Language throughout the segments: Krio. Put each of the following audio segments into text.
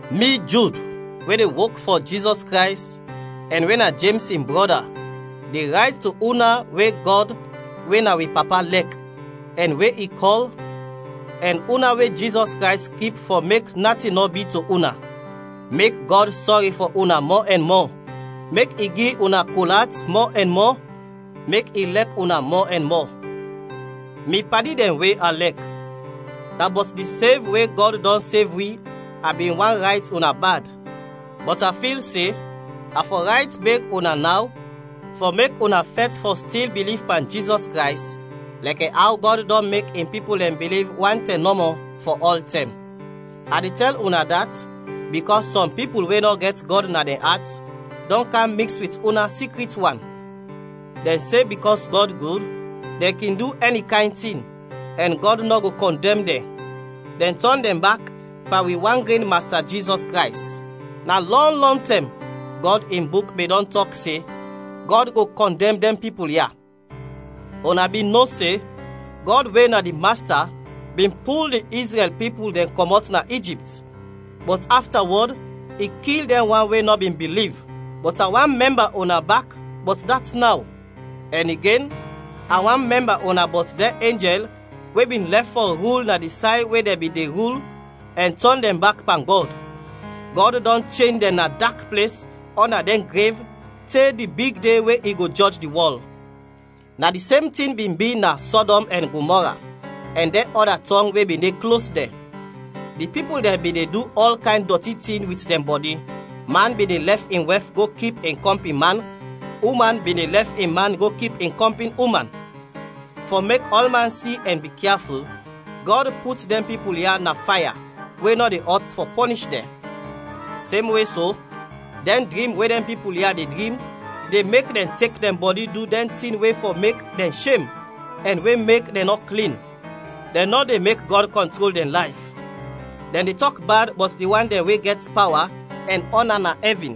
Mi Jud, we de wok fɔ Jizɔs Krays ɛn we na Jems in brɔda, de rayt to una we Gɔd we na wi Papa lɛk, ɛn we i kɔl, ɛn una we Jizɔs Krays kip fɔ mek natin nɔ bi to una: Mek Gɔd sɔri fɔ una mɔ ɛn mɔ, mek i gi una kol at mɔ ɛn mɔ, mek i lɛk una mɔ ɛn mɔ. Mi padi dɛn we a lɛk, na bɔt di sev we Gɔd dɔn sev wi a bin want rayt una bad, bɔt a fil se a fɔ rayt beg una naw fɔ mek una fɛt fɔ stil biliv pan Jizɔs Krays lɛkɛ aw Gɔd dɔn mek in pipul dɛn biliv wan tɛm nɔmɔ, fɔ ɔltɛm. A de tɛl una dat bikɔs sɔm pipul we nɔ gɛt Gɔd na dɛn at dɔn kam miks wit una sikrit wan; dɛn se bikɔs Gɔd gud, dɛn kin du ɛni kayn tin, ɛn Gɔd nɔ go kɔndɛm dɛn; dɛn tɔn dɛn bak pan wi wan gren Masta Jizɔs Krays. Na lɔn, lɔntɛm, Gɔd in Buk bin dɔn tɔk se Gɔd go kɔndɛm dɛn pipul ya. Una bin no se, Gɔd we na di Masta bin pul di Izrɛl pipul dɛn kɔmɔt na Ijipt, bɔt aftawɔd i kil dɛn wan we nɔ bin biliv, bɔt a want mɛmba una bak bɔt dat naw. Ɛn igen a want mɛmba una bɔt dɛn enjɛl we bin lɛf fɔ rul na di say we dɛn bin de rul ɛn tɔn dɛn bak pan Gɔd, Gɔd dɔn chen dɛn na dak ples ɔnda dɛn grev te di big de we i go jɔj di wɔl. Na di sem tin bin bi na Sɔdɔm ɛn Gomɔra ɛn dɛn ɔda tɔng we bin de klos dɛn: di pipul dɛn bin de du ɔl kayn dɔti tin wit dɛn bɔdi, man bin de lɛf in wɛf go kip in kɔmpin man, uman bin de lɛf in man go kip in kɔmpin uman. Fɔ mek ɔlman si ɛn bikyaful, Gɔd put dɛn pipul ya na faya we nɔ de ɔt fɔ pɔnish dɛn. Semwe so, dɛn drim we dɛn pipul ya de drim de mek dɛn tek dɛn bɔdi du dɛn tin we fɔ mek dɛn shem ɛn we mek dɛn nɔ klin; dɛn nɔ de mek Gɔd kɔntrol dɛn layf, dɛn de tɔk bad bɔt di wan dɛn we gɛt pawa ɛn ɔna na ɛvin.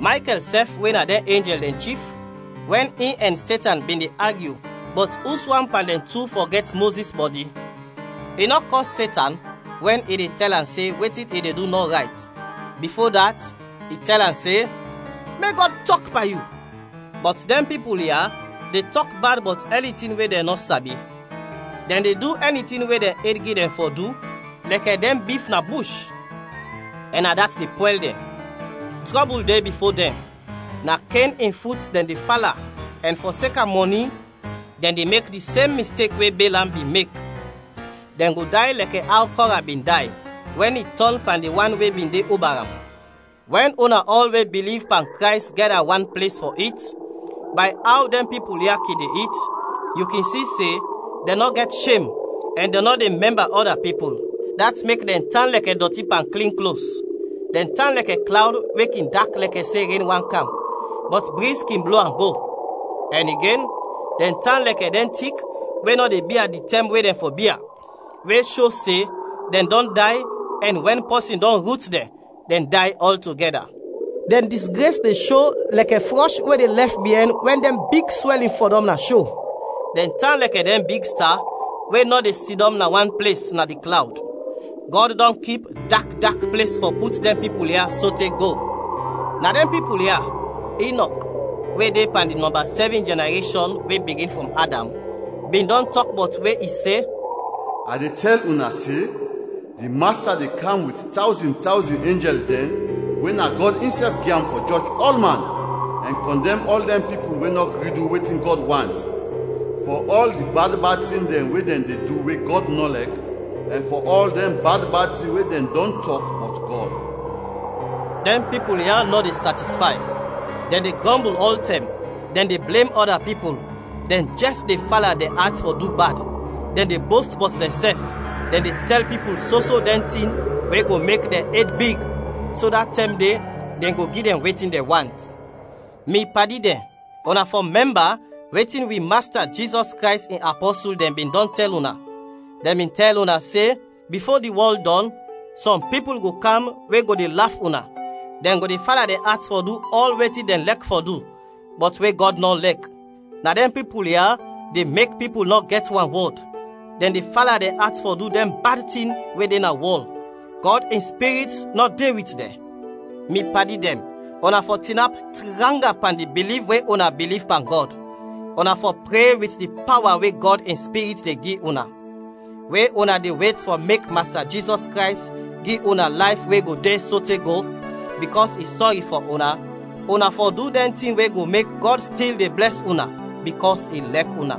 Maykɛl sɛf we na dɛn enjɛl dɛn chif, wɛn in ɛn Setan bin de agyu bɔt uswan pan dɛn tu fɔ gɛt Mozis bɔdi, i nɔ kɔs Setan wɛn i de tɛl am se wetin i de du nɔ rayt, bifo dat, i tɛl am se, “Mek Gɔd tɔk pan yu!” Bɔt dɛn pipul ya de tɔk bad bɔt ɛni tin we dɛn nɔ sabi; dɛn de du ɛni tin we dɛn ed gi dɛn fɔ du lɛkɛ dɛn bif na bush, ɛn na dat de pwɛl dɛn. Trɔbul de bifo dɛn! Na Ken in fut dɛn de fala ɛn fɔseka mɔni dɛn de mek di sem mistek we Belam bin mek, dɛn go day lɛkɛ aw Kɔra bin day wɛn i tɔn pan di wan we bin de oba am. Wɛn una ɔl we biliv pan Krays gɛda wan ples fɔ it, bay aw dɛn pipul ya kin de it, yu kin si se dɛn nɔ gɛt shem ɛn dɛn nɔ de mɛmba ɔda pipul, dat mek dɛn tan lɛkɛ dɔti pan klin klos; dɛn tan lɛkɛ klawd we kin dak lɛkɛ se ren want kam, bɔt briz kin blo am go; ɛn igen, dɛn tan lɛkɛ dɛn tik we nɔ de bia di tɛm we dɛn fɔ bia, we sho se dɛn dɔn day ɛn wɛn pɔsin dɔn rut dɛn, dɛn day ɔltogɛda. Dɛn disgres de sho lɛkɛ frɔsh we de lɛf biɛn wɛn dɛn big swɛlin fɔdɔm na sho; dɛn tan lɛkɛ dɛn big sta we nɔ de sidɔm na wan ples na di klawd, Gɔd dɔn kip dak dak ples fɔ put dɛn pipul ya sote go. Na dɛn pipul ya, Inɔk, we de pan di nɔmba sɛvin jɛnareshɔn we bigin frɔm Adam, bin dɔn tɔk bɔt we i se: “A de tɛl una se di Masta de kam wit tawzin tawzin enjɛl dɛn we na Gɔd insɛf gi am fɔ jɔj ɔlman, ɛn kɔndɛm ɔl dɛn pipul we nɔ gri du wetin Gɔd want, fɔ ɔl di bad bad tin dɛn we dɛn de du we Gɔd nɔ lɛk, ɛn fɔ ɔl dɛn bad bad tin we dɛn dɔn tɔk bɔt Gɔd!” Dɛn pipul ya nɔ de satisfay, dɛn de grɔmbul ɔltɛm, dɛn de blem ɔda pipul, dɛn jɛs de fala dɛn at fɔ du bad, dɛn de bost bɔt dɛnsɛf, dɛn de tɛl pipul soso dɛn tin we go mek dɛn ed big so da tɛm de dɛn go gi dɛn wetin dɛn want. Mi padi dɛn, una fɔ mɛmba wetin wi Masta Jizɔs Krays in apɔsul dɛn bin dɔn tɛl una. Dɛn bin tɛl una se, “Bifo di wɔl dɔn, sɔm pipul go kam we go de laf una, dɛn go de fala dɛn at fɔ du ɔl wetin dɛn lɛk fɔ du, bɔt we Gɔd nɔ lɛk.” Na dɛn pipul ya de mek pipul nɔ gɛt wanwɔd, dɛn de fala dɛn at fɔ du dɛn bad tin we de na wɔl, Gɔd in Spirit nɔ de wit dɛn. Mi padi dɛn, una fɔ tinap tranga pan di biliv we una biliv pan Gɔd. Una fɔ pre wit di pawa we Gɔd in Spirit de gi una. We una de wet fɔ mek Masta Jizɔs Krays gi una layf we go de sote go, bikɔs i sɔri fɔ una, una fɔ du dɛn tin we go mek Gɔd stil de blɛs una bikɔs i lɛk una.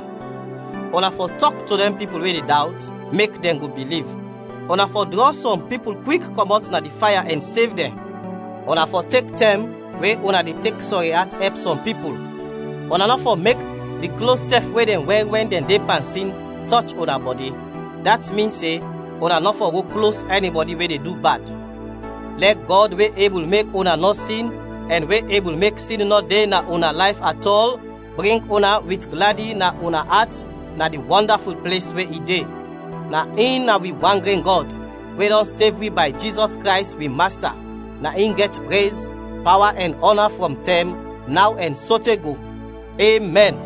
Una fɔ tɔk to dɛn pipul we de dawt, mek dɛn go biliv. Una fɔ drɔ sɔm pipul kwik kɔmɔt na di faya ɛn sev dɛn; una fɔ tek tɛm we una de tek sɔri at ɛp sɔm pipul, una nɔ fɔ mek di klos sɛf we dɛn wɛr wɛn dɛn de pan sin tɔch una bɔdi, dat min se una nɔ fɔ go klos ɛnibɔdi we de du bad. Lɛ Gɔd we ebul mek una nɔ sin ɛn we ebul mek sin nɔ de na una layf atɔl, bring una wit gladi na una at na di wɔndaful ples we i de. Na in na wi wan gren Gɔd, we dɔn sev wi bay Jizɔs Krays, wi Masta, na in gɛt prez, pawa ɛn ɔna frɔm tɛm, naw ɛn sote go! Emɛn.